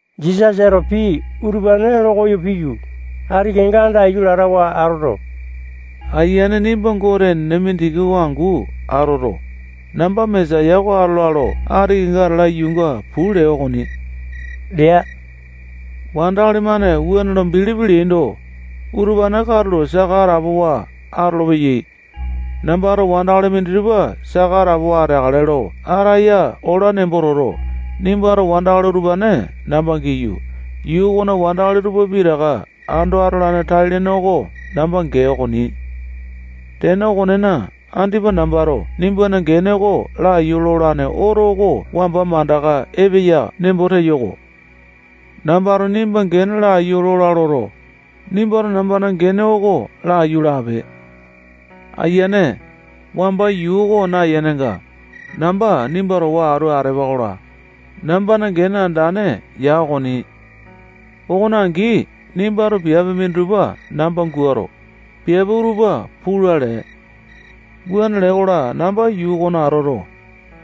Jisasato pii utupane lokoyo piyu, ati kenga andaiyu latawa atoto, Ayiane nimba Gote enene mindiki oko angu atoto, namba Mesaya oko atola lo ati kenga atala yuunga puu lee okoni lea. Wandakali-mane wuane lo bilipi leaindo, utupane katulo saka atapowa atolopeyai. Nambato wandakali minditupa saka atapowa ateakale lo ataya ola nembo toto, nimbato wandakali utupane namba giyu, yuu okona wandakali tupa pitaka ando atolane tai-lene oko namba gee okoni. Tene okonena, andipa nambato nimbana gene oko laiyu lolane oto oko wamba mandaka epeya nembo teyo-ko. Nambato nimba gene laiyu lola loto, nimbato nambana gene oko laiyu lape. Ayiane, wamba yuu oko nayenenga, namba nimba towa atu atepa-kola, nambana gene andane ya okoni. Okone angi, nimbato piape minditupa namba guato, piape utupa pula lee. Wuane lee-kola, namba yuu okona atoto,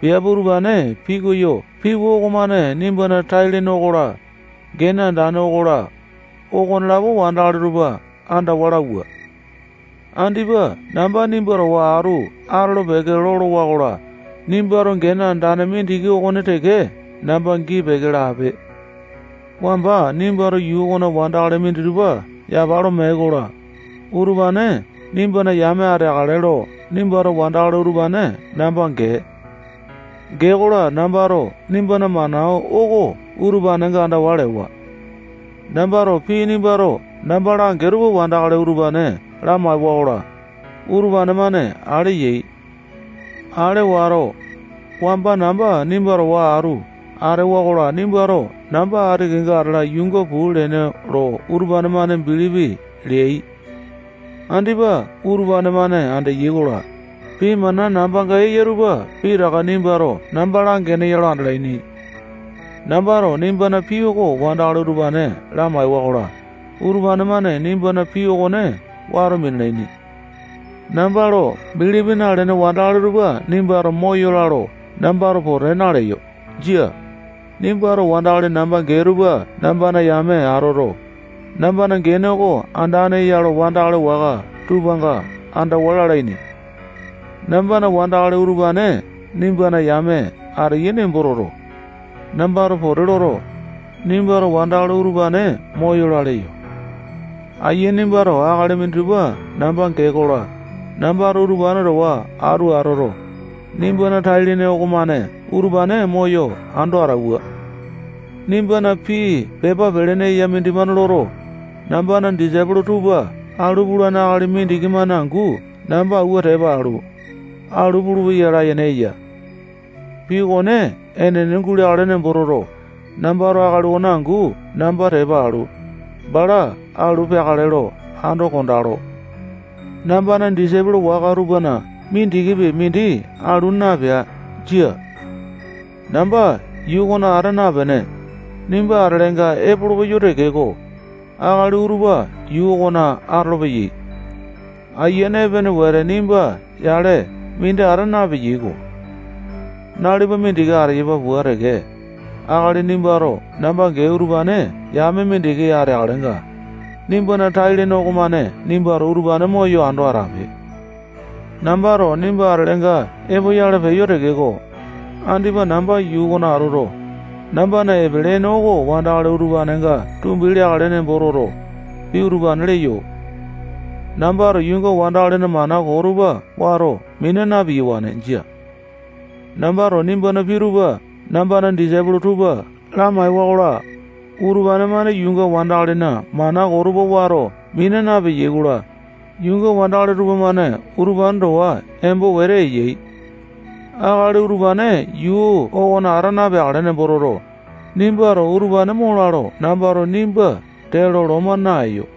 piape utupane pikoyo piwa okomane nimbana tai-lene okola, gene andane okola, okonelapo wandakali tupa andawa lauwa. Andipa namba nimba towa atu atolo-peke lolowa-kola, nimbato gene andane mindiki okone teke namba gii-peke lape. Wamba nimbato yuu okona wandakali minditupa yapa lo mee-kola, utupane nimbana yame ateakale lo nimbato wandakali utupane namba gee. Gee-kola, nambato nimbana mana oko utupanenga andawa lewa. Nambato pii nimbato namba langee tupa wandakali utupane lamaewa-kola, utupane-mane ale yai. Ale wato, wamba namba nimba towa atu atewa-kola, nimbato namba ati kenga atala yuunga puu leene lo utupane-mane bilipi leai. Andipa utupane-mane andeya-kola, pii mana nambanga eya tupa pitaka nimbato namba langeene ya lo andalaini. Nambato nimbana pii oko wandakali utupane lamaewa-kola, utupane-mane nimbana pii okone wato minalaini. Namba lo bilipi nalene wandakali tupa nimbato moyola lo nambato pote naleyo. Jia. Nimbato wandakali namba gee tupa nambana yame atoto, nambana gene oko andane eya lo wandakali waka tupanga andawa lalaini. Nambana wandakali utupane nimbana yame ateyai nembo toto, nambato pote loto, nimbato wandakali utupane moyola leyo. Ayiane nimbato akali minditupa namba gee-kola, nambato utupane towa atu atoto, nimbana tai-lene okomane utupane moyo ando atauwa. Nimbana pii pepa pelene eya mindimane loto, nambana disaipolo tupa alu pulane akali mindiki-mane angu namba awua tepa alu, alu pulupeya layene eya. Pii okone enene guleakale nembo toto, nambato akali okone angu namba tepa alu, bala alu peakale lo ando kondalo. Nambana disaipolo waka tupana mindikipi mindi alu napea. Jia. Namba yuu okona ata napene, nimba atelenga epolopeyo tekeko, akali utupa yuu okona atolopeyai. Ayiane epene wete nimba yale mindi ata napeya-ko. Nalipa mindiki ateyapa pua teke, akali nimbato namba gee utupa yame mindiki ateakalenga, nimbana tai-lene okomane nimbato utupane moyo ando atape. Nambato nimba atelenga epoyale peyo tekeko, andipa namba yuu okona atoto, nambana epele ene oko wandakali utupanenga tumbi leakale nembo toto, pii utupane leyo. Nambato yuunga wandakalina mana koo tupa wato mina na-piyawane. Jia. Nambato nimbana pii tupa nambana disaipolo tupa lamaewa-kola, utupane-mane yuunga wandakalina mana koo tupa wato mina napeyai-kola, yuunga wandakali tupamane utupane towa embo wete eyai. Akali utupane yuu okona ata napeakale nembo toto, nimbato utupane mola lo nambato nimba tee lo loma naeyo.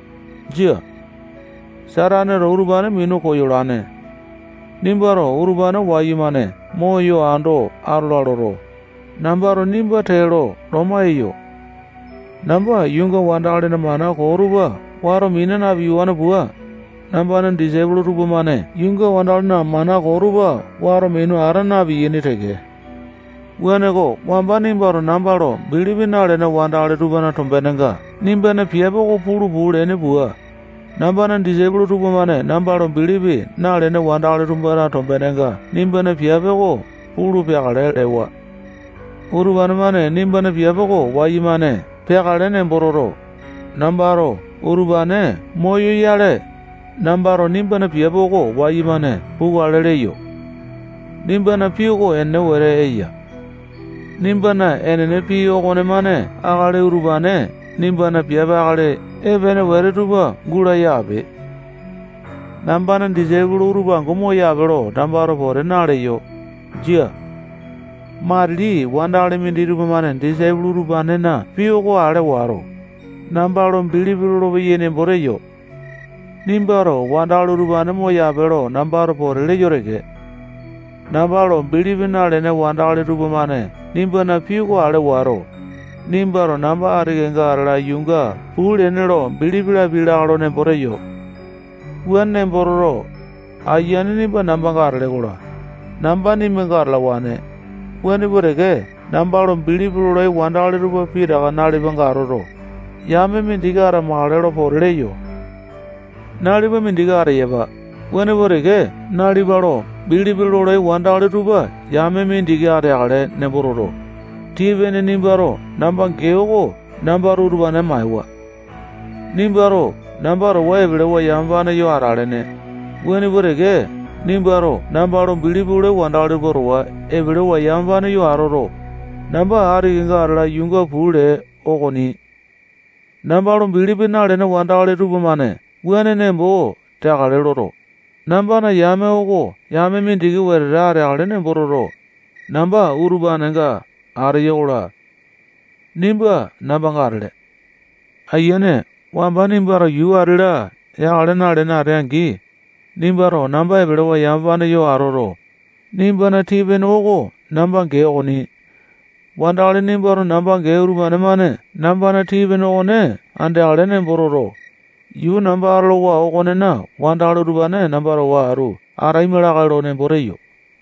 Jia. Sataneto utupane minu koyolane. Nimbato utupane wayumane moyo ando atola loto, nambato nimba tee lo loma eyo. Namba yuunga wandakalina mana koo tupa wato mina na-piyawane pua, nambana disaipolo tupamane yuunga wandakalina mana koo tupa wato minu ata na-piyaini teke. Wuaneko, wamba nimbato namba lo bilipi nalene wandakali tupana tombenenga nimbana piape oko pulu puu leene pua, nambana disaipolo tupamane namba lo bilipi nalene wandakali tupana tombenenga nimbana piape oko pulu peakale lewa. Utupane-mane nimbana piape oko wayumane peakale nembo toto, nambato utupane moyoyale, nambato nimbana piape oko wayumane pukale leyo. Nimbana pii oko enene wetete eya. Nimbana enene pii okonemane akali utupane nimbana piape akali epene wete tupa gulaya ape. Nambana disaipolo utupa angu moyape lo nambato pote naleyo. Jia. Matili wandakali minditupa-mane disaipolo utupanena pii oko ale wato, namba lo bilipi lolopeyai nembo teyo. Nimbato wandakali utupane moyape lo nambato pote leyo teke. Namba lo bilipi nalene wandakali tupamane nimbana pii oko ale wato, nimbato namba ati kenga atala yuunga puu leene lo bilipi lapiai lakae lo nembo teyo. Wuane nembo toto, Ayiane nimba nambanga atele-kola, namba nimbanga atalawane, wuane pua teke namba lo bilipi lolai wandakali tupa pitaka nalipanga atoto, yame mindiki atamakale lo pote leyo. Nalipa mindiki ateyapa, wuane pua teke nalipa lo bilipi lolai wandakali tupa yame mindiki ateakale nembo toto, tii-pene nimbato namba gee oko nambato utupane maewa. Nimbato namba towa epelewa yamapane yo atalene, wuane pua teke nimbato namba lo bilipi lolai wandakali tupa towa epelewa yamapane yo atoto, namba ati kenga atala yuunga puu lee okoni. Namba lo bilipi nalene wandakali tupamane wuane nembo teakale loto, nambana yame oko yame mindiki wetete ateakale nembo toto, namba utupanenga ateyo-kola, nimba nambanga atele. Ayiane, wamba nimbato yuu ati-la yakale nalene atee-angi, nimbato namba epelewa yamapane yo atoto, nimbana tii-pene oko namba gee okoni. Wandakali nimbato namba gee utupane-mane nambana tii-pene okone andeakale nembo toto, yuu namba atolowa okonena wandakali utupane namba towa atu ataima lakae lo nembo teyo.